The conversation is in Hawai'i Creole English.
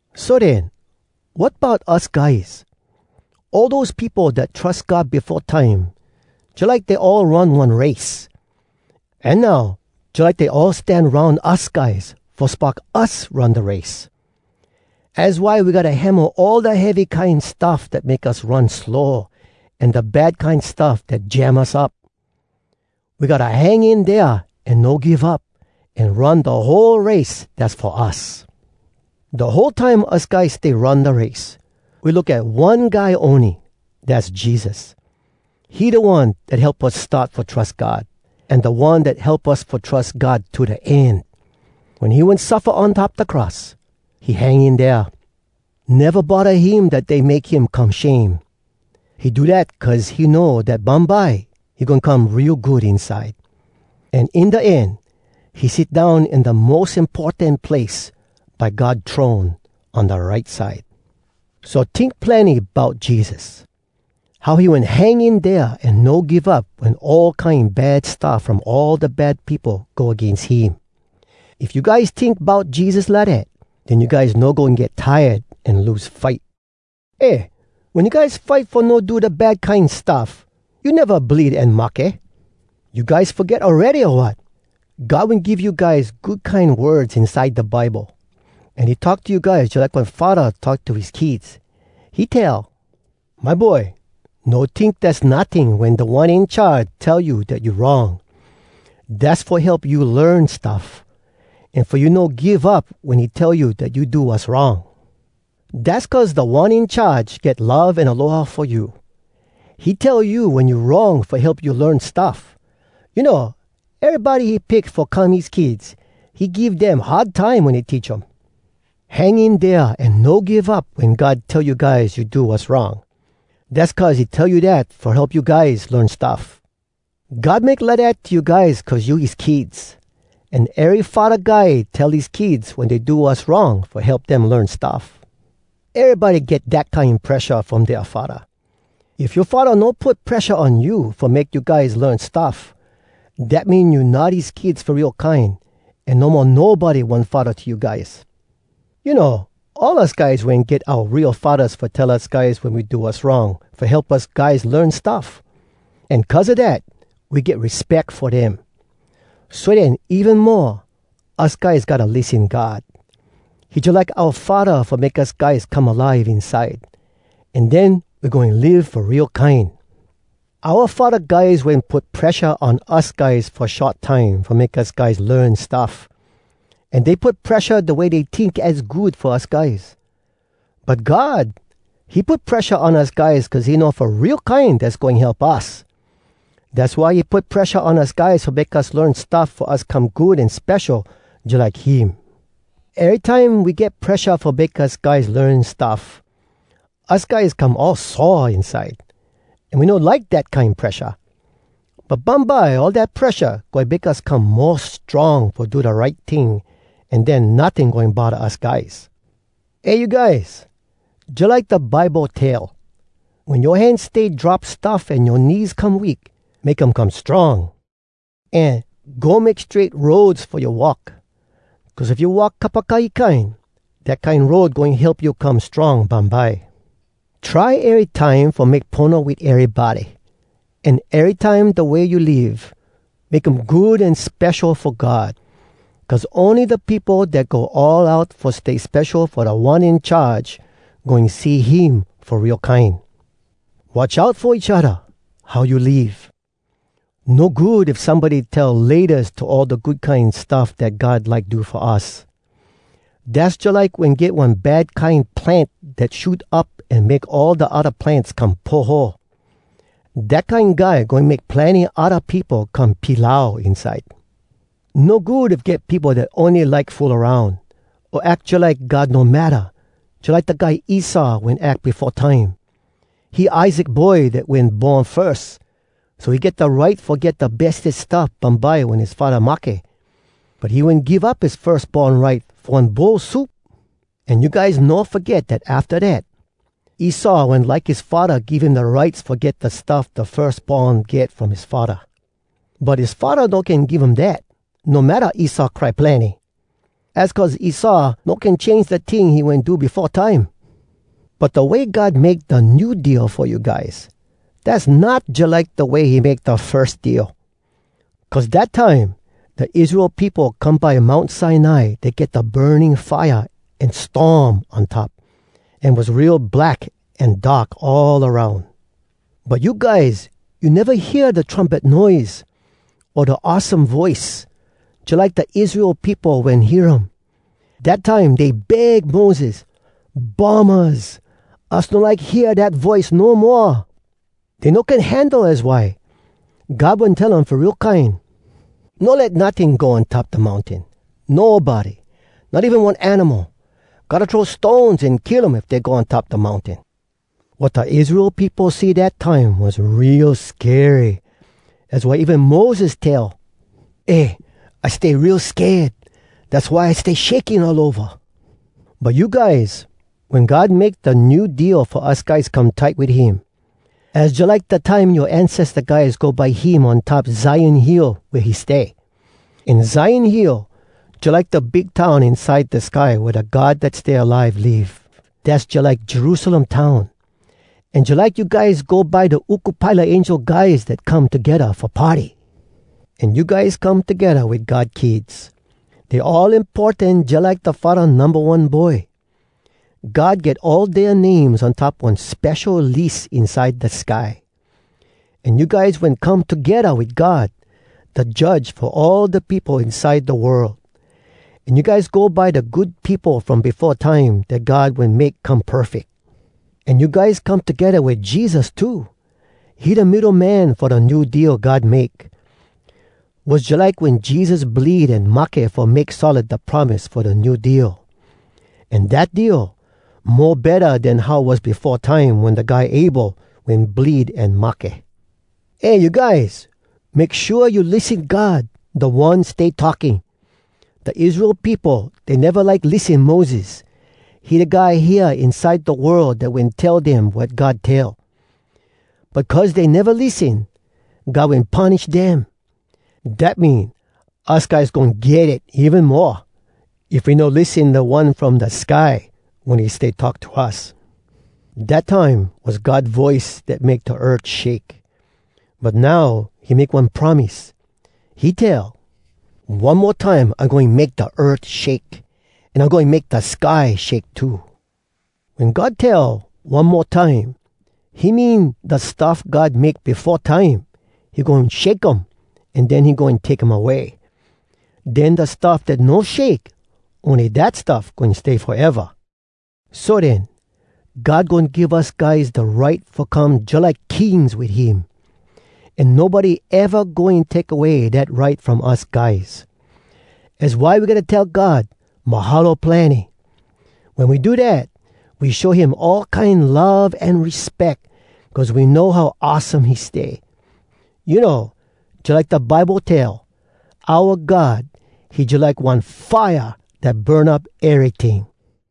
So den, wat bout us guys? All dose peopo dat trus God befo time, jalike dey all run one race. An now, jalike dey all stan aroun us guys fo spock us run da race. Az why we gotta hemo all da heavy kine stuff dat make us run slow, an da bad kine stuff dat jam us up. We gotta hang in dea an no give up, an run da whole race dass fo us. Da whole time us guys stay run da race, we look at one guy ony, dass Jesus. He da One dat help us start fo trus God, an da One dat help us fo trus God to da end. Wen he wen suffa on top da cross, he hang in dea. Neva bodda him dat dey make him come shame. He do dat cuz he know dat bumbye he goin come real good inside. An in da end, he sit down in da mos importan place, by God throne, on da right side. So tink plenny bout Jesus! How he wen hang in dea an no give up wen all kine bad stuff from all da bad peopo go agains him. If you guys tink bout Jesus lidat, den you guys no goin get tired an lose fight. Eh! Wen you guys fight fo no do da bad kine stuff, you neva bleed an mahke. You guys foget awready, o wat? God wen give you guys good kine words inside da Bible. An he talk to you guys jalike one faddah talk to his kids. He tell, “My boy, no tink dass notting Wen Da One In Charge tell you dat you wrong. Dass fo help you learn stuff, An fo you no give up wen he tell you dat you do wass wrong. Dass cuz Da One In Charge get love an aloha fo you. He tell you wen you wrong fo help you learn stuff. You know, erybody he pick fo come his kids, He give dem hard time wen he teach um.” Hang in dea an no give up wen God tell you guys you do wass wrong. Dass cuz he tell you dat fo help you guys learn stuff. God make lidat to you guys cuz you his kids. An ery faddah guy tell his kids wen dey do wass wrong fo help dem learn stuff. Erybody get dat kine presha from dea faddah. If yoa faddah no put presha on you fo make you guys learn stuff, dat mean you not his kids fo real kine an no mo nobody one faddah to you guys. You know, all us guys wen get oua real faddahs fo tell us guys wen we do wass wrong fo help us guys learn stuff. An cuz a dat, we get respeck fo dem. So den even mo, us guys gotta lissen God. He jalike oua Faddah fo make us guys come alive inside. An den we goin live fo real kine! Oua faddah guys wen put presha on us guys fo short time fo make us guys learn stuff, an dey put presha da way dey tink az good fo us guys. But God, he put presha on us guys cuz he know fo real kine dass goin help us. Dass why he put presha on us guys fo make us learn stuff fo us come good an spesho jalike him. Erytime we get presha fo make us guys learn stuff, us guys come all sore inside, an we no like dat kine presha. But bumbye all dat presha goin make us come mo strong fo do da right ting, an den notting goin bodda us guys. Eh you guys! Jalike da Bible tell, “Wen yoa hands stay drop stuff an yoa knees come weak, make um come strong!” An, “Go make strait roads fo you walk. Cuz if you walk kapakahi kine,” dat kine road goin help you come strong bumbye. Try erytime fo make pono wit erybody, an erytime da way you live, make um good an spesho fo God. Cuz ony da peopo dat go all out fo stay spesho fo Da One In Charge goin see him fo real kine. Watch out fo each odda, how you live. No good if somebody tell “Laytas” to all da good kine stuff dat God like do fo us. Dass jalike wen get one bad kine plant dat shoot up an make all da odda plants come poho. Dat kine guy goin make plenny odda peopo come pilau inside. No good if get peopo dat ony like fool aroun, o ack jalike God no matta, jalike da guy Esau wen ack befo time. He Isaac boy dat wen born firs, so he get da right fo get da bestes stuff bumbye wen his faddah mahke. But he wen give up his firs born right fo one bowl soup! An you guys no foget dat afta dat, Esau wen like his faddah give him da rights fo get da stuff da firs born get from his faddah. But his faddah no can give um dat, no matta Esau cry plenny. Az cuz Esau no can change da ting he wen do befo time. But da way God make da New Deal fo you guys, dass not jalike da way he make da firs deal. Cuz dat time, da Israel peopo come by Mount Sinai dat get da burning fire an storm on top, an was real black an dark all aroun. But you guys, you neva hear da trumpet noise, o da awesome voice, jalike da Israel peopo wen hear um. Dat time dey beg Moses, “Bummahs! Us no like hear dat voice no moa!” Dey no can handle, az why. God wen tell um fo real kine, “No let notting go on top da mountain! Nobody! Not even one animal! Gotta throw stones an kill um if dey go on top da mountain!” Wat da Israel peopo see dat time was real skery, az why even Moses tell, “Eh! I stay real sked! Dass why I stay shaking all ova!” But you guys, wen God make da New Deal fo us guys come tight wit him, az jalike da time yoa ancesta guys go by him on top Zion Hill wea he stay. An Zion Hill, jalike da big town inside da sky wea da God Dat Stay Alive live, dass jalike Jerusalem Town. An jalike you guys go by da uku pile a angel guys dat come togedda fo party. An you guys come togedda wit God kids. Dey all importan jalike da Faddah numba one Boy. God get all dea names on top one spesho lis inside da sky. An you guys wen come togedda wit God, da Judge fo all da peopo inside da world. An you guys go by da good peopo from befo time dat God wen make come perfeck. An you guys come togedda wit Jesus too. He da middo man fo da New Deal God make. Was jalike wen Jesus bleed an mahke fo make solid da promise fo da New Deal. An dat deal, mo betta den how was befo time wen da guy Abel wen bleed an mahke. Eh, you guys! Make shua you lissen God, da One stay talking. Da Israel peopo, dey neva like lissen Moses. He da guy hea inside da world dat wen tell dem wat God tell. But cuz dey neva lissen, God wen punish dem. Dat mean, us guys goin get it even moa, if we no lissen da One from da sky wen he stay talk to us! Dat time was God voice dat make da earth shake. But now, he make one promise. He tell, “One mo time I goin make da earth shake, an I goin make da sky shake too.” Wen God tell, “One mo time,” he mean, da stuff God make befo time, he goin shake um, an den he goin take um away. Den da stuff dat no shake, ony dat stuff goin stay foeva. So den, God goin give us guys da right fo come jalike kings wit him. An nobody eva goin take away dat right from us guys. Az why we gotta tell God “Mahalo plenny.” Wen we do dat, we show him all kine love an respeck, cuz we know how awesome he stay. You know, jalike da Bible tell, “Oua God, he jalike one fire dat burn up eryting.”